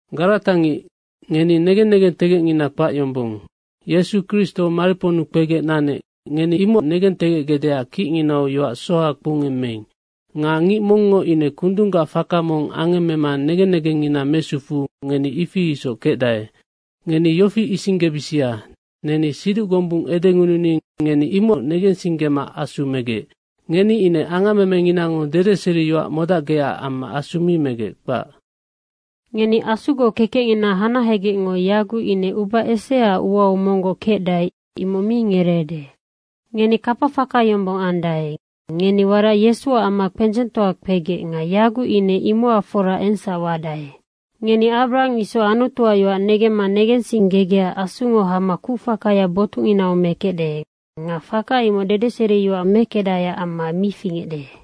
Garata ngic, ngeni negen negentegecngina kpac yombong. Yesu Kristo mariponnu kpegec nanec, ngeni imoc negentegecgecdeac kicnginau yoac soha kpoungemmeing. Nga ngic mongngo ine kundunggac faka mong angemmema negen negengngina mesufuu ngeni ifi isoc kecdae. Ngeni yofi isinggebisia, neni siduc gombung edengununi ngeni imoc negensinggema Asu megecnoc. Ngeni ine angammemenginango dedeseriyoac modacgecac amma Asu mi megec, kpac. Ngeni Asugoc kekecngina hanahegecngo yaguc ine uba eseaac uau monggoc kecdae, imoc mi ngereede. Ngeni kapafaka yombong andae. Ngeni warac Yesuac amma kpendzengtoa kpegec. Nga yaguc ine imocac fora engsac wadae. Ngeni Abrahang isoc Anutuac yoac negemma negensinggegecac Asungo hama kucfakaya botucnginau mekecde. Nga faka imoc dedeseriyoac mekecdaeac amma mi fingecde.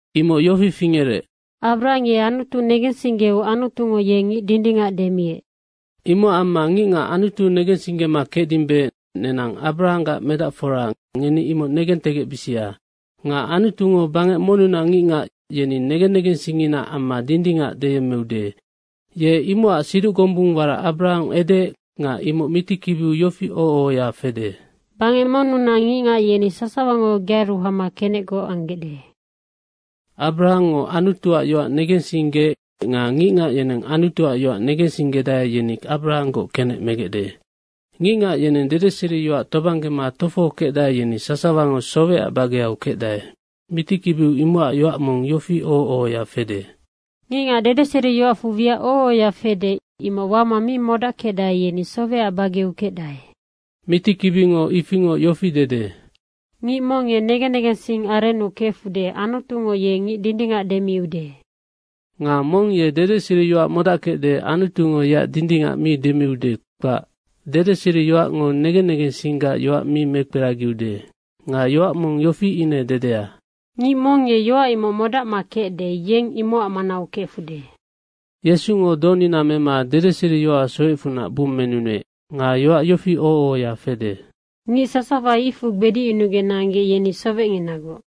Imoc yofi fingerec, Abrahang ye Anutu negensinggeu Anutungo ye ngic dindingac demiec. Imocac amma ngicngac Anutu negensinggema kecdimbe, nenang Abarahanggac medacfora, ngeni imoc negentegecbisia. Nga Anutungo bangec monnunac ngicngac, yeni negen negensingnginaac amma dindingac deyemmeude. Ye imocac siduc gombung warac Abarahang edeec nga imoc mitikibiu yofi oho ohoya fede, “Bangec monnunac ngicngac, yeni sasawango gearu hama kenecgoc anggecde.” Abrahangngo Anutuac yoac negensinggeec nga ngicngac yeneng Anutuac yoac negensinggedae, yeni Abrahanggoc kenec megecde. Ngicngac yeneng dedeseriyoac tobanggema tofohokecdae, yeni sasawango sowecac bageu kecdae. Mitikibiu imocac yoac mong yofi oho ohoya fede, “Ngicngac dedeseriyoacfu wiac oho ohoya fede, imoc wama mi modackecdae, yeni sowecac bageu kecdae.” Mitikibingo ifingoc yofi dede, “Ngic mong ye negen negensing arennu kefude, Anutungo ye ngic dindingac demiude.” Nga mong ye dedeseriyoac modackecde, Anutungo yeac dindingac mi demiude, kpac. Dedeseriyoacngo negen negensinggac yoac mi mekperagiude. Nga yoac mong yofi ine dedea, “Ngic mong ye yoac imoc modacma kecde, yeng imocac manau kefude.” Yesungo donina mema dedeseriyoacac sowecfunac bummenunuec. Nga yoac yofi oho ohoya fede, “Ngic sasawa icfu gbedicyunugec nanggec, yeni sowecnginagoc.”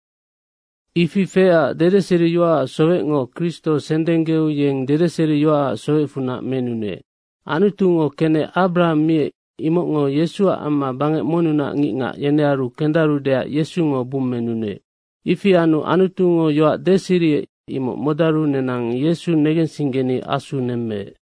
Ifi feecac dedeseriyoacac sowecngo Kristo sendenggeu yeng dedeseriyoacac sowecfunac menunuec. Anutungo kenec Abrahang miec, imocngo Yesuac amma bangec monnunac ngicngac, yenearu kendarudeac Yesungo bummenunuec. Ifi anu Anutungo yoac deseriec, imoc modaru nenang Yesu negensinggeni Asu nemmeec.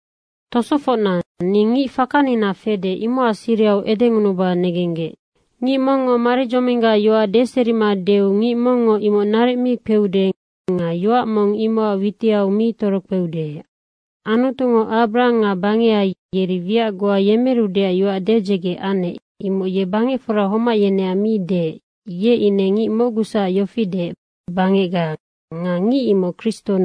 Tosofocna, ni ngic fakanina fede imocac sirihau edengunuba negenggec. Ngic mongngo maridzominggac yoac deserima deu ngic mongngo imoc naric mi kpeude nga yoac mong imocac witiau mi torokpeude. Anutungo Abrahang nga bangeha yeri wiac goa yemerudeac yoac dedzege anec, imoc ye bangecfora homac yeneac mi deec. Ye ine ngic mocguacsac yofi deec, “bangecga.” Nga ngic imocnoc Kristo.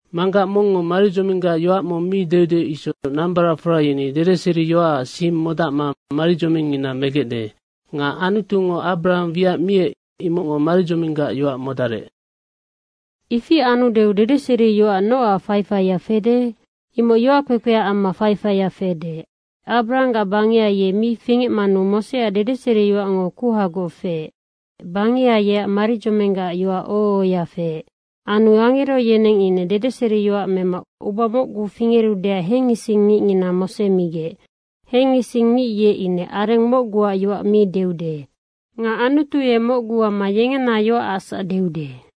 Manggac mongngo maridzominggac yoac mong mi deude isoc nambaracfora yeni dedeseriyoacac sing modacma maridzomingngina megecde. Nga Anutungo Abrahang wiac miec imocngo maridzominggac yoac modarec. Ifi anudeu dedeseriyoac nocac faifaia fede? Imoc yoackpekpeac amma faifaia fede. Abrahanggac bangeha ye mi fingecmanu Moseac dedeseriyoacngo kuhagoc feec. Bangeha yeacnoc maridzominggac yoac oho ohoya feec. Anu angero yeneng ine dedeseriyoac mema uba mocgu fingerudeac hengising ngicngina Mose migec. Hengising ngic ye ine areng mocguac yoac mi deude. Nga Anutu ye mocgu amma yengena yoacacsac deude.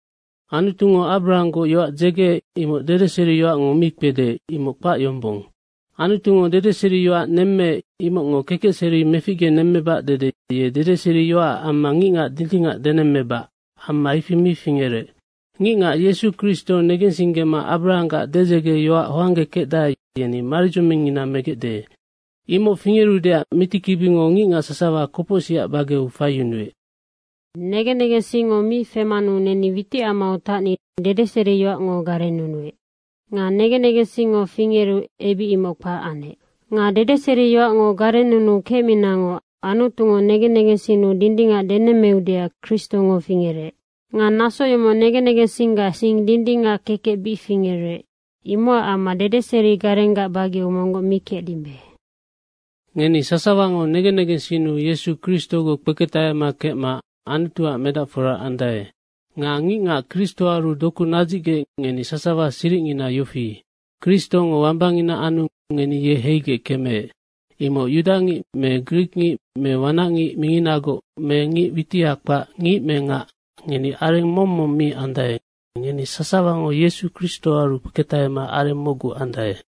Anutungo Abrahanggoc yoac dzegeec, imoc dedeseriyoacngo mi kpede, imoc kpac yombong. Anutungo dedeseriyoac nemmeec, imocngo kekecseri meficgenemmebac dede ye dedeseriyoacac amma ngicngac dindingac denemmebac, amma ifi mi fingerec. Ngicngac Yesu Kristo negensinggema Abrahanggac dedzegeyoac hoanggekecdae, yeni maridzomingngina megecde. Imoc fingerudeac mitikibingo ngicngac sasawa kopocsicac bageu faiyunuec. Negen negensingngo mi femanu neni witicamau tacni, dedeseriyoacngo garennunuec. Nga negen negensingngo fingeru ebic imoc kpac anec. Nga dedeseriyoacngo garennunuu kecminangoc Anutungo negen negensinnu dindingac denemmeudeac Kristongo fingerec. Nga naso yomoc negen negensinggac sing dindingac kekec bic fingerec. Imocac amma dedeseri garenggac bageu monggoc mi kecdimbe. Ngeni sasawango negen negensinnu Yesu Kristogoc kpeketahema kecma Anutuac medacfora andae. Nga ngicngac Kristoaru doku nadzicgec, ngeni sasawa siricngina yofi, Kristongo wambangina anu ngeni ye heigec kemeec. Imoc yudangic me grikngic me wanacngic minginagoc me ngic witiha kpac, ngic me ngac, ngeni areng mong mong mi andae, ngeni sasawango Yesu Kristoaru kpeketahema areng mocgu andae.